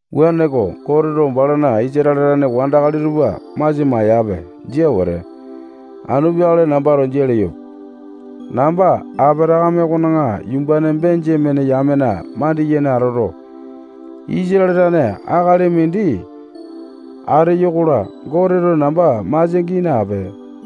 Wuaneko, Goteto balana Isatale tane wandakali tupa masia maeyape. Jia wete. Anu peakale nambato jia leyope. Namba Apatakame okona yumbane Benjamene yamena mandiyene atoto, Isatale tane akali mindi ateyo-kola, Goteto namba masia gii nape.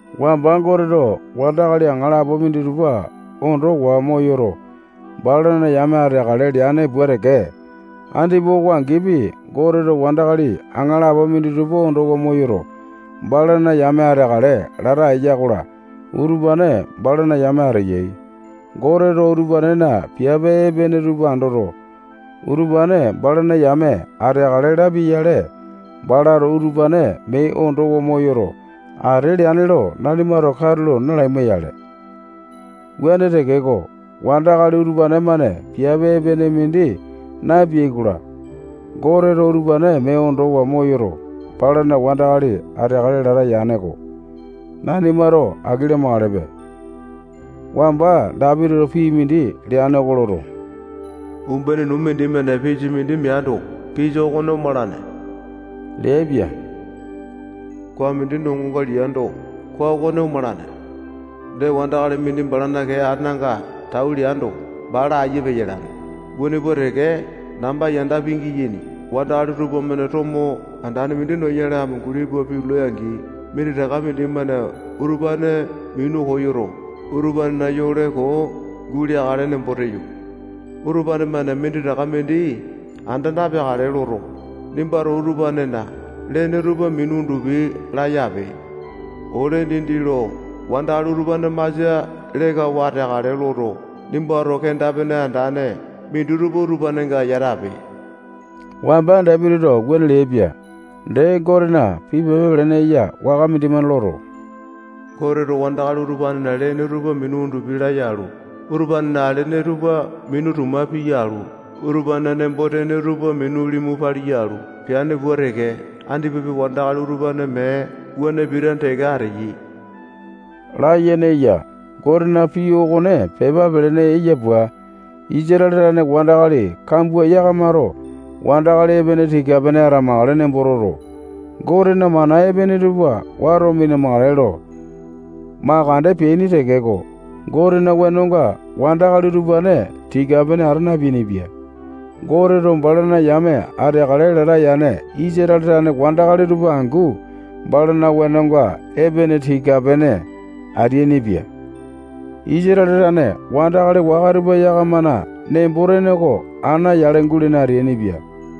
Wamba Goteto wandakali aŋalapo minditupa ondowa moyoto, balana yame ateakale leane pua teke, andipa oko angipi, Goteto wandakali aŋalapo minditupa ondowa moyoto, balana yame ateakale lata eya-kola, utupane balana yame ateyai. Goteto utupanena piape epene tupa andoto, utupane balana yame ateakale lapia-yale, balato utupane mee ondowa moyoto, ate leane lo nanimato katulo nalaima-yale. Wuane tekeko, wandakali utupane-mane piape epene mindi napeai-kola, Goteto utupane mee ondowa moyoto, balana wandakali ateakale lata yane-ko. Nanimato aki lamakalepe. Wamba Dapitito pii mindi leane oko loto, umbene nuu mindimane pisa mindi meando, pisa okone omalane leaipia. Koa mindi nongonga liando, koa okone omalane. Dee, wandakali mindi balana kee ananga tau leando, bala aiya peyalane. Wuane pua teke, namba yanda pingiyaini wandakali tupamane tomo andane mindi noyale amunguli pua pitulai-angi, minditaka mindimane utupane minu koyoto, utupanena yole koo guleakale nembo teyo. Utupane-mane minditaka mindi anda napeakale loto, nimbato utupanena lene tupa minu undupi laya ape. Ole dindi lo wandakali utupane masia lekawa ateakale loto, nimbato kenda-pene andane minditupa utupanenga yatape. Wamba Dapitito wuane leaipia. Dee, Gotena pii pepa pelene eya waka mindimane loto, Goteto wandakali utupanena lene tupa minu undupi laya alu, utupanena alene tupa minu tuma piya alu, utupanena nembo-tene tupa minu limu paliya alu, peane pua teke, andipapi wandakali utupane mee wuane pitane teke ateyai layene eya. Gotena pii okone pepa pelene eya pua, Isatale tane wandakali kambua yakamato wandakali epene tika-pene atamakale nembo toto, Gotena mana epene tupa wato mina-makale lo makande peaini tekeko, Gotena wenonga wandakali utupane tika-pene ata napeainipia. Goteto balana yame ateakale lata yane Isatale tane wandakali tupa angu balana wenonga epene tika-pene ateainipia. Isatale tane wandakali waka tupa yakamana nembo-tene oko ana yale gulene ateainipia.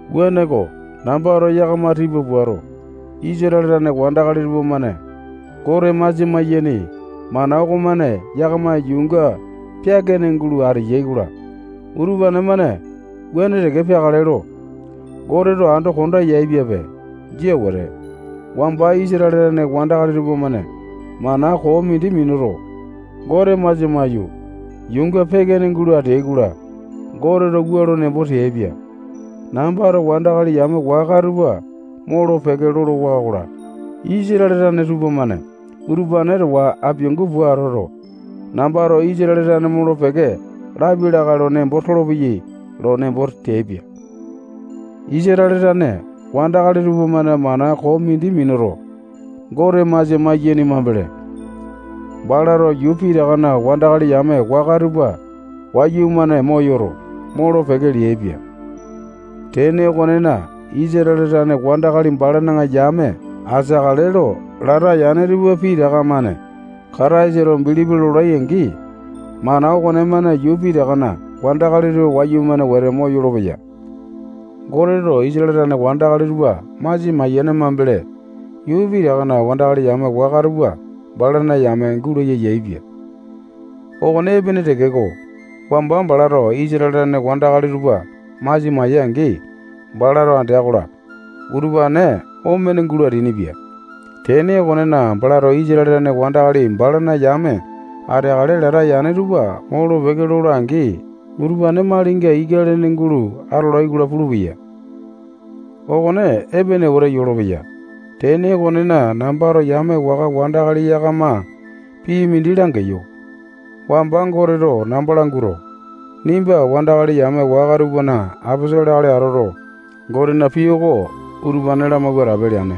Wuaneko, nambato yakama tipa puato, Isatale tane wandakali tupamane Gote masia maiyaini mana okomane yakama yuunga peaka-ene gulo ateai-kola, utupane-mane mee wuane teke peakale lo Goteto ando konda yaepiape. Jia wete. Wamba Isatale tane wandakali tupamane mana koo mindi minuto, Gote masia maiyu, yuunga peake-ene gulo ateai-kola, Goteto wua lo nembo teaipia: Nambato wandakali yame waka tupa molo-peke lolowa-kola, Isatale tane tupamane utupane towa apiangu pua atoto, nambato Isatale tane molo-peke lapia lakae lo nembo tolopeyai lo nembo teaipia. Isatale tane wandakali tupamane mana koo mindi minuto, Gote masia maiyaini mambele, balato yuu pitakana wandakali yame waka tupa wayumane moyoto, molo-peke leaipia. Tene okonena, Isatale tane wandakali balana yame ateakale lo lata yane tupa pitaka-mane Kataisa lo bilipi lolai-angi, mana okonemane yuu pitakana wandakali tupa wayumane wete moyolo-peya. Goteto Isatale tane wandakali tupa masia mayane mambele, yuu pitakana wandakali yame waka tupa balana yame gulaya yaepia. Okone epene tekeko, wamba balato Isatale tane wandakali tupa masia maya-angi, balato andea-kola, utupane omene gulo ateainipia. Tene okonena, balato Isatale tane wandakali balana yame ateakale lata yane tupa molo-peke lola-angi, utupane malinga ika lene gulo atolai-kola pulupeya. Okone epene wete yolopeya. Tene okonena, nambato yame waka wandakali yakama pii mindi langeyo. Wamba Goteto namba languato, nimba wandakali yame waka tupana aposolo akali atoto, Gotena pii oko utupane lamauwa atape leane.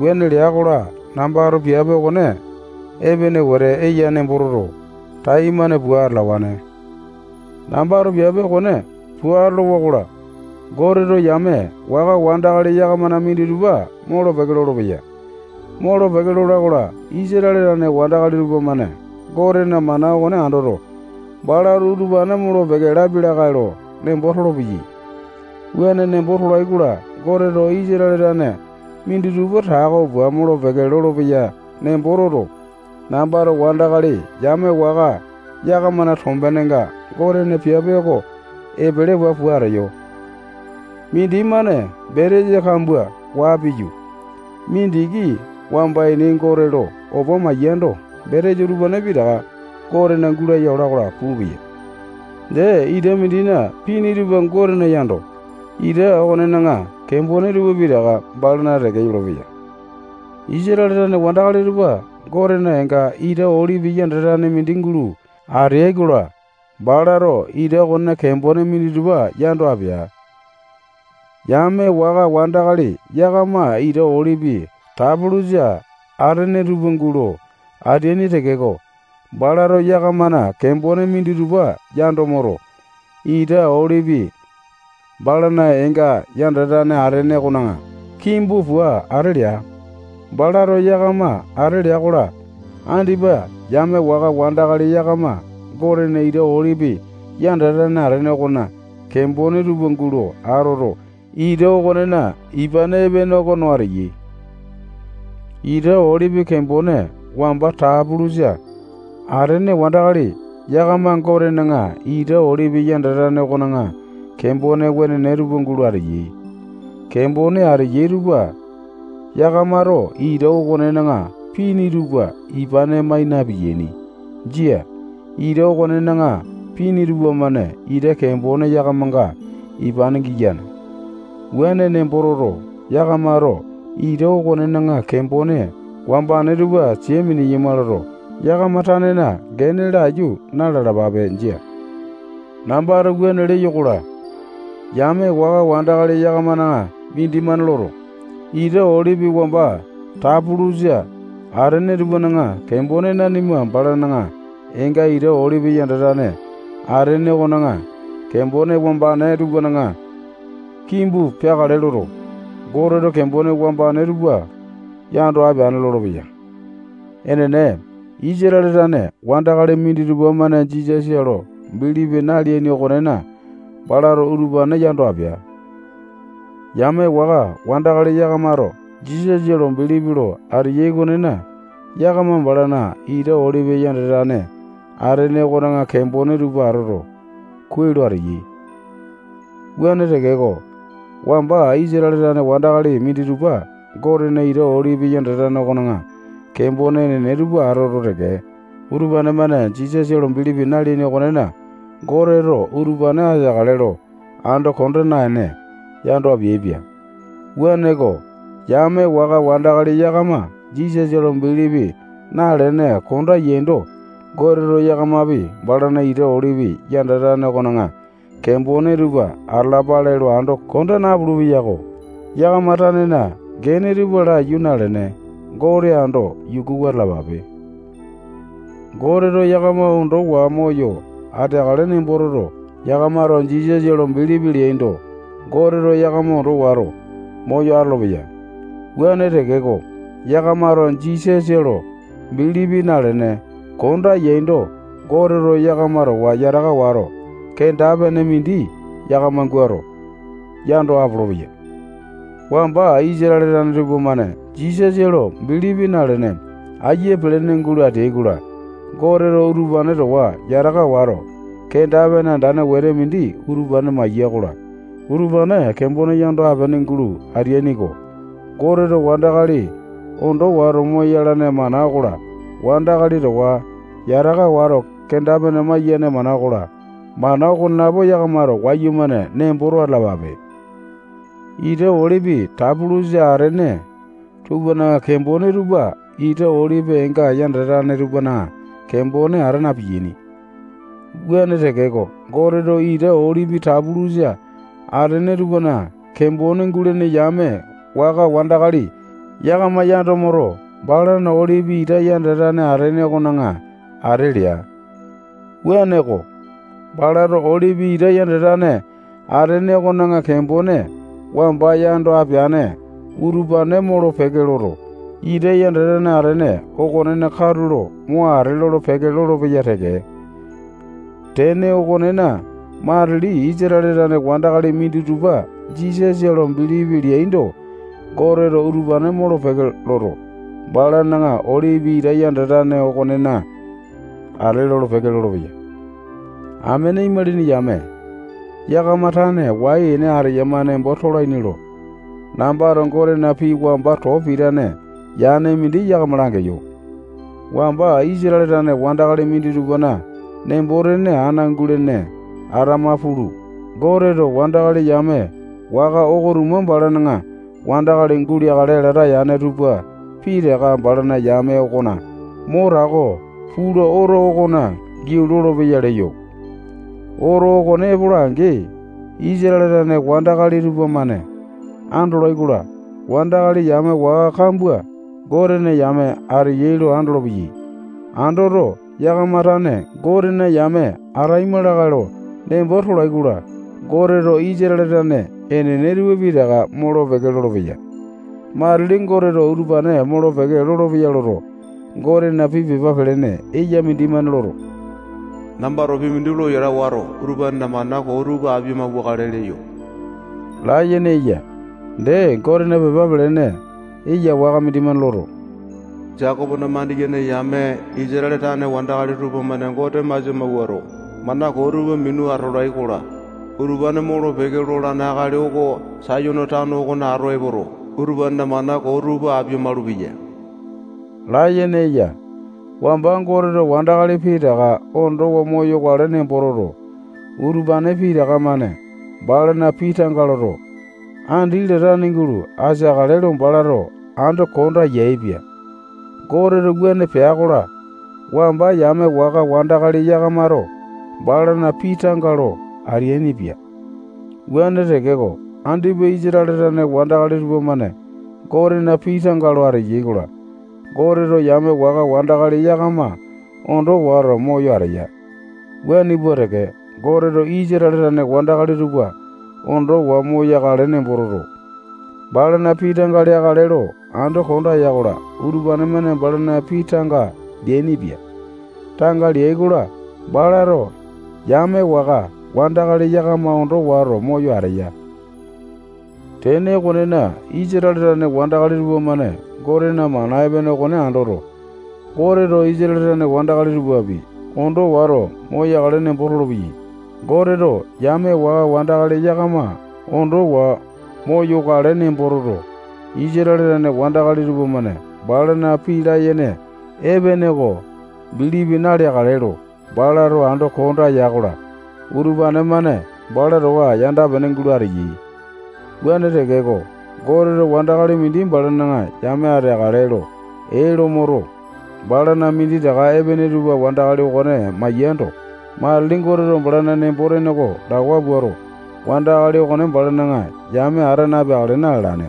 Wuane lea-kola, nambato piape okone epene wete eya nembo toto, taimane pua atalawane. Nambato piape okone pua atolowa-kola, Goteto yame waka wandakali yakamana minditupa molo-peke lolopeya. Molo-peke lola-kola, Isatale tane wandakali tupamane Gotena mana okone andoto, balato utupane molo-peke lapia lakae lo nembo tolopeyai. Wuane nembo tolai-kola, Goteto Isatale tane minditupa tako pua molo-peke lolopeya nembo toto, nambato wandakali yame waka yakamana tombenenga Gotena piape oko epelewa pua ateyo. Mindimane betesa kambua waa piyu, mindiki wamba ini Gote lo opa maiyando, betesa utupane pitaka Gotena gulaya ola-kola pulupeya. Dee, ita mindina pini tupa Gotena yando, ita okonena kembone tupa pitaka balana teke yolopeya. Isatale tane wandakali tupa Gotena eenga ita olipi yandatane mindi gulo atea-kola, balato ita okonena kembone minditupa yando apea. Yame waka wandakali yakama ita olipi tapulusa atene tupa gulo ateaini tekeko, balato yakamana kembone minditupa yando moto, ita olipi balana eenga yandatane atene okona kimbu pua ate lea. Balato yakama ate lea-kola, andipa yame waka wandakali yakama Gotena ita olipi yandatane atene okona kembone tupa gulo atoto, ita okonena ipane epene oko no ateyai. Ita olipi kembone wamba tapulusa atene wandakali yakama Gotena ita olipi yandatane okona kembone wenene tupa gulo ateyai. Kembone ateyai tupa yakamato ita okonena pini tupa ipane mai na-piyaini. Jia. Ita okonena pini tupamane ita kembone yakamanga ipane giyane. Wuane nembo toto, yakamato ita okonena kembone wambane tupa sia mineyama loto, yakama tanena gene tupa laiyu na-lalapape. Jia. Nambato wuane leyo-kola, yame waka wandakali yakamana mindimane loto, ita olipi wamba tapulusa atene tupana kembone nanima balana eenga ita olipi yandatane atene okona kembone wambane tupana kimbu peakale loto, Goteto kembone wambane tupa yando apeane lolopeya. Enene, Isatale tane wandakali minditupa-mane Jisasa lo bilipi naleaini okonena, balato utupane yando apea. Yame waka wandakali yakamato Jisasa lo bilipi lo ateyai okonena, yakama balana ita olipi yandatane atene okona kembone tupa atoto, kuai lo ateyai. Wuane tekeko, wamba Isatale tane wandakali minditupa Gotena ita olipi yandatane okona kembone enene tupa atoto teke, utupane-mane Jisasa lo bilipi naleaini okonena, Goteto utupane ateakale lo ando konda naene, yando apeaipia. Wuaneko, yame waka wandakali yakama Jisasa lo bilipi nalene konda yaindo, Goteto yakamapi balana ita olipi yandatane okona kembone tupa atalapale lo ando konda napulu-peyako. Yakama tanena gene tupa laiyu nalene, Gote ando yukuwa atalapape. Goteto yakama ondowa moyo ateakale nembo toto, yakamato Jisasa lo bilipi leaindo, Goteto yakama ondo wato, moyo atolopeya. Wuane tekeko, yakamato Jisasa lo bilipi nalene, konda yaindo, Goteto yakama towa yataka wato, kenda-pene mindi yakama guato, yando apolopeya. Wamba Isatale tane tupamane Jisasa lo bilipi nalene, aiya pelene gulo ateai-kola, Goteto utupane towa yataka wato, kenda-pene andane wete mindi utupane maiya-kola, utupane kembone yando apene gulo ateaini-ko. Goteto wandakali ondo wato moyalane mana okola, wandakali towa yataka wato kenda-pene maiyane mana okola, mana okonelapo yakamato wayumane nemboto atalapape. Ita olipi tapulusa atene tupana kembone tupa ita olipi eenga yandatane tupana kembone ata na-piyaini. Wuane tekeko, Goteto ita olipi tapulusa atene tupana kembone gulene yame waka wandakali yakama yando moto, balana olipi ita yandatane atene okona ate lea. Wuaneko, balato olipi ita yandatane atene okona kembone wamba yando apeane utupane molo-peke loto, ita yandatane atene okonena katulo mo ate lolo-peke lolopeya teke. Tene okonena, matili Isatale tane wandakali minditupa Jisasa lo bilipi leaindo, Goteto utupane molo-peke loto, balana olipi ita yandatane okonena ate lolo-peke lolopeya. Amene imalini yame, yakama tane wai ene ateyama nembo tolaini lo, nambato Gotena pii wamba too pitane yane mindi yakama langeyo. Wamba Isatale tane wandakali minditupana nembo-tene ana gulene atama pulu, Goteto wandakali yame waka oko-tuma balana wandakali guleakale lata yane tupa pitaka balana yame okona mo tako pula oto okona giau lolopeyai leyo. Oto okone epola-angi, Isatale tane wandakali tupamane andolai-kola, wandakali yame waka kambua Gotena yame ateyai lo andolopeyai. Andoto, yakama tane Gotena yame ataima lakae lo nembo tolai-kola, Goteto Isatale tane enene tupa pitaka molo-peke lolopeya. Matili Goteto utupane molo-peke lolopeya loto, Gotena pii pepa pelene eya mindimane loto, nambato pii mindi lo yata wato, utupanena mana koo tupa apia-mauwakale leyo layene eya. Dee, Gotena pii pepa pelene eya waka mindimane loto, Jekopona mandiyene yame Isatale tane wandakali tupamane Gote masia mawuato, mana koo tupa minu atolai-kola, utupane molo-peke lolane akali oko Sayone tano okona ato epoto, utupanena mana koo tupa apia-malupeya layene eya. Wamba Goteto wandakali pitaka ondowa moyokale nembo toto, utupane pitaka-mane balana pii tanga loto, andi latane gulo ateakale lo balato ando konda yaepia. Goteto wuane pea-kola, wamba yame waka wandakali yakamato balana pii tanga lo ateainipia. Wuane tekeko, andipa Isatale tane wandakali tupamane Gotena pii tanga lo ateyai-kola, Goteto yame waka wandakali yakama ondo wato moyo ateya. Wuane pua teke, Goteto Isatale tane wandakali tupa ondowa moyokale nembo toto, balana pii tanga leakale lo ando konda ya-kola, utupane-mane balana pii tanga leainipia. Tanga leai-kola, balato yame waka wandakali yakama ondo wato moyo ateya. Tene okonena, Isatale tane wandakali tupamane Gotena mana epene okone andoto, Goteto Isatale tane wandakali tupapi ondo wato moyakale nembo tolopeyai. Goteto yame waka wandakali yakama ondowa moyokale nembo toto, Isatale tane wandakali tupamane balana pii layene epene oko bilipi naleakale lo balato ando konda ya-kola, utupane-mane bala towa yanda-pene gulo ateyai. Wuane tekeko, Goteto wandakali mindi balana yame ateakale lo ee lo moto, balana minditaka epene tupa wandakali okone maiyando, matili Goteto balana nembo-tene oko lawa puato, wandakali okone balana yame ata napeakale na-lalane.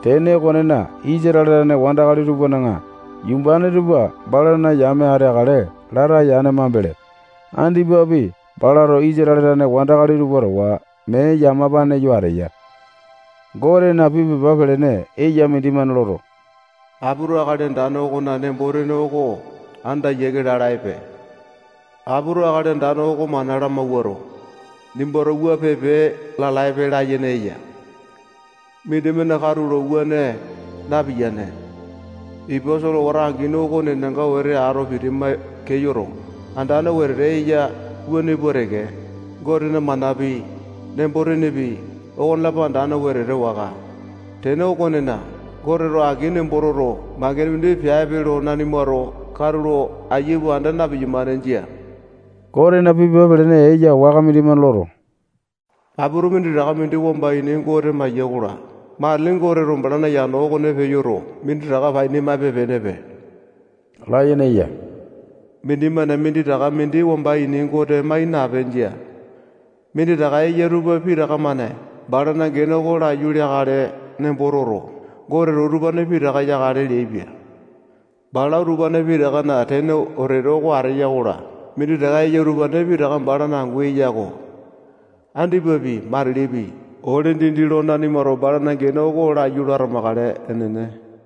Tene okonena, Isatale tane wandakali tupana yumbane tupa balana yame ateakale lata yane mambele, andipapi balato Isatale tane wandakali tupa towa mee yamapane yo ateya. Gotena pii pepa pelene eya mindimane loto, apito Akali Andane okona nembo-tene oko anda yiake lalaepe. Apito Akali Andane oko mana lamawuato, nimbato wua pipe lalaepe layene eya. Mindimane katulo wuane napiyane. Ipa solewata angini oko nenanga wete ato pitima keyoto andane wetete eya wuane pua teke, Gotena manapi, nembo-tenepi, okonelapo andane wetete waka. Tene okonena, Goteto aki nembo toto, mangene mindi peape lo nanimato katulo aiya pua anda na-piyamane. Jia. Gotena pii pepa pelene eya waka mindimane loto, apito minditaka mindi wamba ini Gote maeya-kola, matili Goteto balana yano okone peyoto, minditaka paini maipe-penepe layene eya. Mindimane minditaka mindi wamba ini Gote mai nape. Jia. Minditaka eya tupa pitaka-mane balana gene oko laiyu leakale nembo toto, Goteto utupane pitaka yakale leaipia. Bala utupane pitakana tene wetete oko ateya-kola, minditaka eya utupane pitaka balana angu eya-ko. Andipapi, matilipi, ole dindi lo nanimato balana gene oko laiyu lo atamakale. Enene.